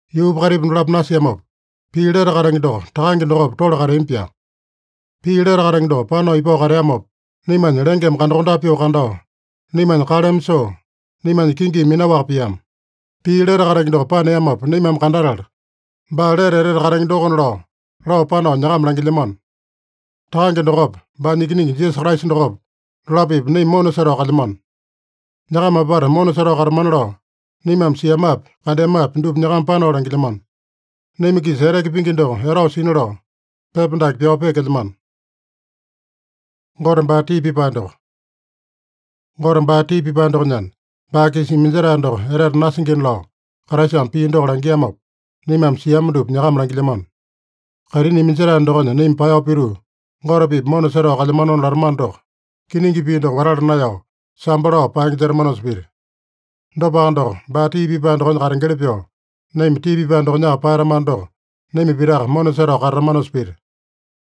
Yuupa kaitipa dolapo nasiamopa, Pii lete katenge doko Takange dokopa tole kateambi-pyaa. Pii lete katenge doko panao ipao kateamopa, naimanya lengeme kandakondape pyoo kandao, naimanya kaleme soo, naimanya kingimi minaowaka piama. Pii lete katenge doko paneamopa naimame kandatala, baa lete etete katenge dokona lao, lao panao nyakama langilyamano. Takange dokopa, baanya Ikiningi Jisasa Kraisa dokopa, dolapo-pipa naima mona setao kalyamano. Nyakama apata mona setao katamana lao, naimame siamapi, kandeamapi dupa nyakama panao langilyamano. Naima-kisa eteke pingi doko etao sina lao, pepa dake pyao peekelyamano. Gote baa tii pipae dokonyana, baa-kisa iminjetae doko etete nasingina lao Kraisame pii doko langiamopa, naimame siama dupa nyakama langilyamano. Kaitini iminjetae dokonya naima paeyao pituu, Gote-pipa mona setao kalyamanona latamano doko, kiningi pii doko watala naeyao, sambo lao paenge jetamanosa pita. Dopaka doko, baa tii pipae dokonya katengeli pyoo, naima tii pipae dokonyaka paeyatamano doko, naima pitaka mona setao katatamanosa pita.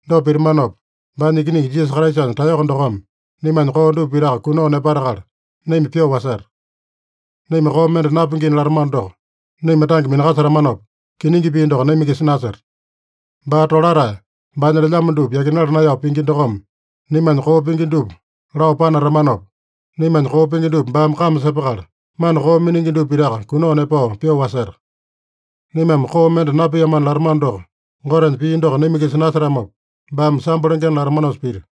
Dopa pitamanopa, baanya Ikiningi Jisasa Kraisanya taeyoko dokome naimanya koo dupa pitaka kunao nepatakala naima pyoo waseta. Naima koo mende napingina latamano doko, naima tange minakasetamanopa, kiningi pii doko naima-kisa naseta. Baa tolatae, baanya lelyamo dupa yakinala naeyao pingi dokome, naimanya koo pingi dupa lao panatamanopa, naimanya koo pingi dupa baame kame sepakala, mana koo miningi dupa pitaka kunao nepao pyoo waseta. Naimame koo mende napiamana latamano doko, Gotenya pii doko naima-kisa nasetamopa, baame sambo lengena latamanosa pita.